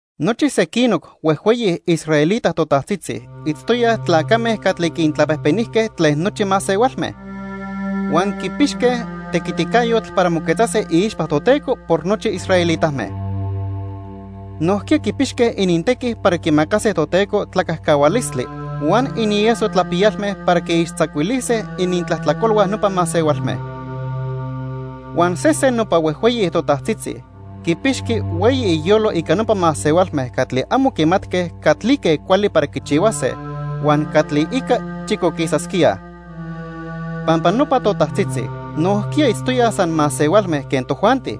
Nochi sequinoc huejhueyi israelita totajtzitzi itztoyaj tlacame catli quintlapejpenijque tlen nochi masehualme. Huan quipixque tequiticayotl para moquetzase iixpa Toteco por nochi israelitame. Nojquiya quipixque inintequi para quimacase Toteco tlacajcahualistli huan inieso tlapiyalme para quiixtzacuilise inintlajtlacolhua nopa masehualme. Huan sesen nopa huejhueyi totajtzitzi quipixqui hueyi iyolo ica nopa masehualme catli amo quimatque catlique cuali para quichihuase huan catli ica chicoquisasquíaj. Pampa nopa totajtzitzi nojquiya itztoyaj san masehualme quen tojuanti,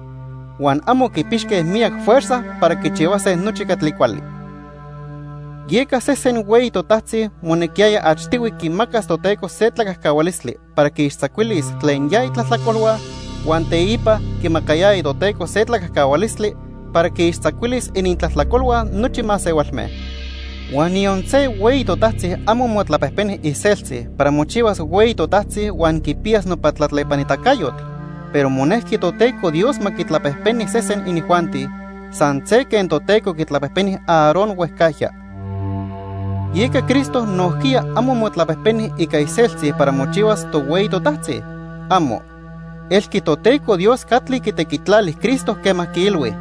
huan amo quipixque miyac fuerza para quichihuase nochi catli cuali. Yeca sesen hueyi totajtzi monequiyaya achtihui quimacas Toteco se tlacajcahualistli para quiixtzacuilis tlen ya itlajtlacolhua huan teipa quimacayaya Toteco se tlacajcahualistli para quiixtzacuilis inintlajtlacolhua nochi masehualme. Huan niyon se hueyi totajtzi amo motlapejpeni iseltzi para mochihuas hueyi totajtzi huan quipiyas nopa tlatlepanitacayotl, pero monejqui Toteco Dios ma quitlapejpeni sesen inijuanti, san se quen Toteco quitlapejpeni Aarón huejcajya. Yeca Cristo nojquiya amo motlapejpeni ica iseltzi para mochihuas tohueyi totajtzi. ¡Amo! Elqui Toteco Dios catli quitequitlali Cristo quema quiilhui: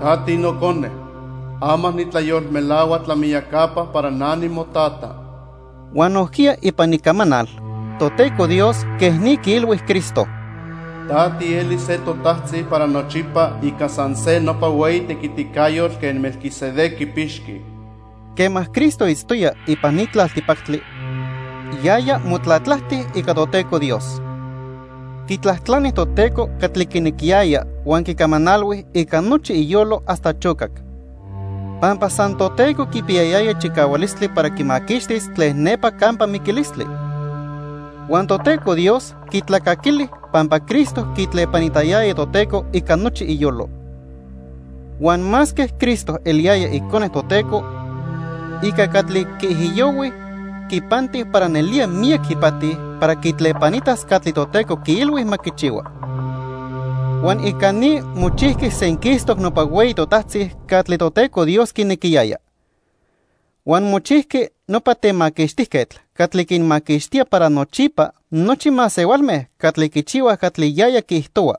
"Ta tiNocone. Ama nitlayolmelahua tlamiyacapa para na nimoTata." Huan nojquiya ipan Icamanal, Toteco Dios quej ni quiilhui Cristo: "Ta tielis se totajtzi para nochipa ica san se nopa hueyi tequiticayotl quen Melquisedec quipixqui." Quema Cristo itztoya ipan ni tlaltipactli, yaya motlatlajti ica Toteco Dios. Quitlajtlani Toteco catli quinequiyaya huan quicamanalhui ica nochi iyolo hasta chocac. Pampa san Toteco quipiyayaya chicahualistli para quimaquixtis tlen nepa campa miquilistli. Huan Toteco Dios quitlacaquili pampa Cristo quitlepanitayaya Toteco ica nochi iyolo. Huan masque Cristo eliyaya Icone Toteco, ica catli quiijiyohui, quipanti para nelía miyac ipati para quitlepanitas catli Toteco quiilhui ma quichihua. Huan ica ni mochijqui senquistoc nopa hueyi totajtzi catli Toteco Dios quinequiyaya. Huan mochijqui nopa Temaquixtijquetl catli quinmaquixtía para nochipa nochi masehualme catli quichihuaj catli yaya quiijtohua,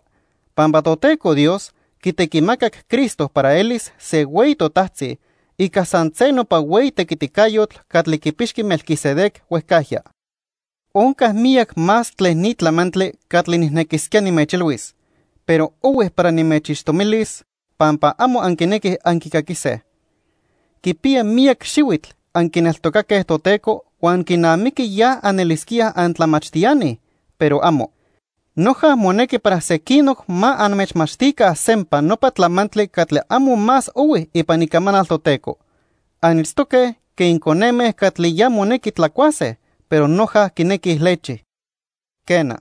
pampa Toteco Dios quitequimacac Cristo para elis se hueyi totajtzi ica san se nopa hueyi tequiticayotl catli quipixqui Melquisedec huejcajya. Onca miyac más tlen ni tlamantli catli nijnequisquía nimechilhuis, pero ohui para nimechixtomilis pampa amo anquinequij anquicaquise. Quipiya miyac xihuitl anquineltocaque Toteco huan quinamiqui ya anelisquíaj antlamachtiani, pero amo. Noja monequi para sequinoc ma anmechmachtica sempa nopa tlamantli catli amo más ohui ipan Icamanal Toteco. Anitztoque quen coneme catli ya monequi tlacuase, pero noja quinequij lechi. Quena,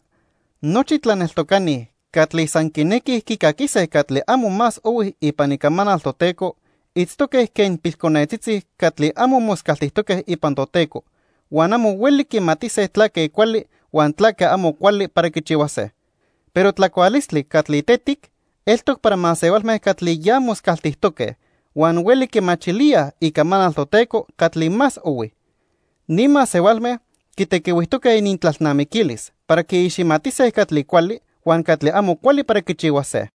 nochi tlaneltocani catli san quinequij quicaquise catli amo más ohui ipan Icamanal Toteco itztoque quen pilconetzitzi catli amo moscaltijtoque ipan Toteco, huan amo hueli quimatise tlaque cuali huan tlaque amo cuali para quichihuase. Pero tlacualistli catli tetic eltoc para masehualme catli ya moscaltijtoque huan hueli quimachilíaj Icamanal Toteco catli más ohui. Ni masehualme quitequihuijtoque inintlalnamiquilis para quiiximatise catli cuali huan catli amo cuali para quichihuase.